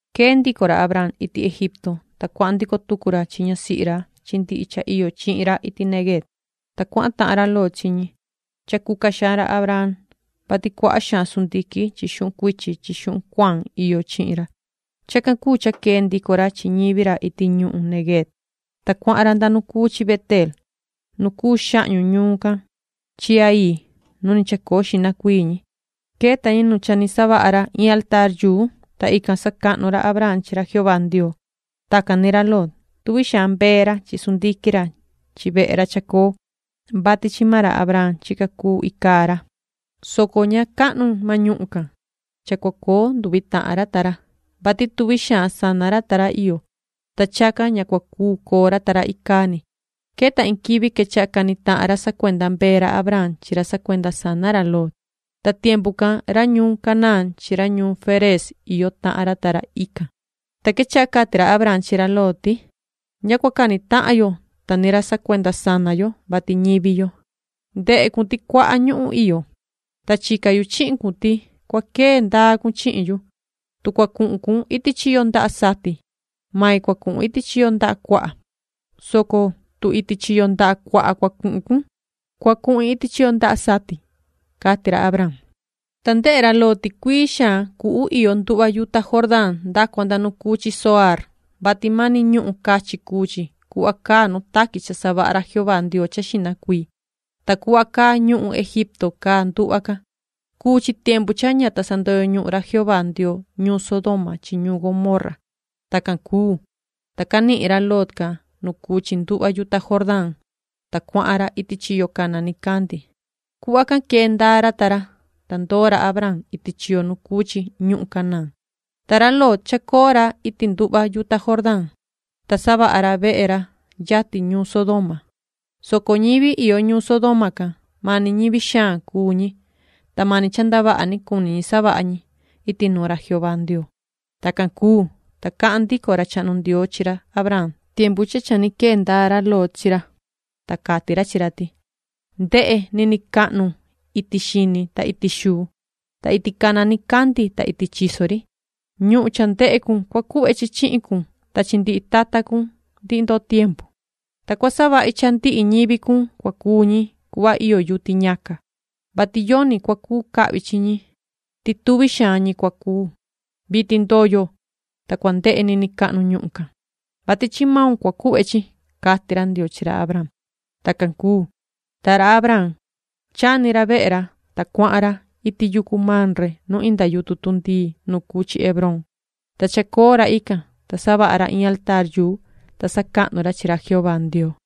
Quee ndico ra Abraam iti Egipto, ta cuahan ndico tucu ra chi ñasihi ra chi ndihi cha iyo chihin ra iti Neguev, ta cuahan tahan ra Lot chi ñi. Cha cuca xaan ra Abraam, vati cuaha xaan sundiquin chi xuhun cuichi chi xuhun cuaan iyo chi ra. Chacan cuu cha quee ndico ra chi ñivi ra iti ñuhun Neguev, ta cuahan ra nda nu cuu chi Beteel nu cuu xahñu ñuun can chi Hai nu ni chacoo xihna cuii ñi. Queta ñi nu cha ni savaha ra iin altaar, ta ican sacahnu ra Abraam chi ra Jehová Ndioo. Tacan ni ra Lot, tuvi xaan mbee ra chi chivu ra chi sundiquin ra chi vehe ra chacoo, vati chi maan ra Abraam chica cuu icaa ra, soco ña cahnu maan ñuhun can cha cua coo nduvi tahan ra ta ra, vati tuvi xaan sana ra ta ra iyo, ta chacan ña cua cuu coo ra ta ra icaa ni. Queta iin quivi quechaha cani tahan ra sacuenda mbee ra Abraam chi ra sacuenda sana ra Lot, ta tiempu can ñivi ñuhun Canaán chi ñivi Ferez iyo tahan ican. Ta quechaha cati ra Abraam chi ra Lot ti: “Ña cua cani tahan yo ta ni ra sacuenda sana yo, vati ñivi yo. Ndehe cun ti cuaha ñuhun iyo, ta chica yu chihin cun, ti cua quee ndaa cun chihin yu. Tu cua cuhun cun iti chiyo ndaha sati, mai cua cuhun iti chiyo ndaha cuaha, soco tu iti chiyo ndaha cuaha cua cuhun cun, cua cuhin iti chiyo ndaha sati”, cati ra Abraam. Ta ndehe ra Lot ti cuii xaan cuhu iyo nduhva yuta Jordán nda cua nda nu cuu chi Zoaar, vati mani ñuhun cachin cuu chi cuhva caa nu taqui cha savaha ra Jehová Ndioo cha xihna cuii, ta cuhva caa ñuhun Egipto caa nduhva can. Cuu chi tiempu cha ña ta sandoyo ñuhun ra Jehová Ndioo ñuun Sodoma chi ñuun Gomorra. Tacan cuu, ta canihin ra Lot can nu cuu chi nduhva yuta Jordán, ta cuahan ra iti chiyo cana nicandi. Cuhva can quee ndaa ra ta ra. Ta ndoo ra Abraam iti chiyo nu cuu chi ñuhun Canaán, ta ra Lot chacoo ra iti nduhva yuta Jordán, ta savaha ra vehe ra yatin ñuun Sodoma, soco ñivi iyo ñuun Sodoma can, mani ñivi xaan cuu ñi, ta mani cha ndavaha ni cuni ñi savaha ñi iti nuun ra Jehová Ndioo. Tacan cuu, ta cahan ndico ra chahnu Ndioo chi ra Abraam tiempu cha cha ni quee ndaa ra Lot chi ra, ta cati ra ti: “Ndehe niniin cahnu iti xini ta iti xuu, ta iti cana nicandi ta iti chiso ri. Ñuhun cha ndehe cun cua cuhve chi chihin cun ta chi ndihi tata cun ndihi ndoo tiempu. Ta cua savahi cha ndihi ñivi cun cua cuu ñi cuhva iyo yuti ñaca, vati yoni cua cuu cahvi chi ñi ti tuvi xaan ñi cua cuu. Vitin ndoyo, ta cua ndehe niniin cahnu ñuhun can, vati chi maun cua cuhve chi”, cati ra Ndioo chi ra Abraam. Tacan cuu, ta ra Abraam chani ra vehe ra, ta cuahan ra iti yucu Mamre nu inda yutun tundii nu cuu chi Hebrón, ta chacoo ra ican. Ta savaha ra iin altaar, ta sacahnu ra chi ra Jehová Ndioo.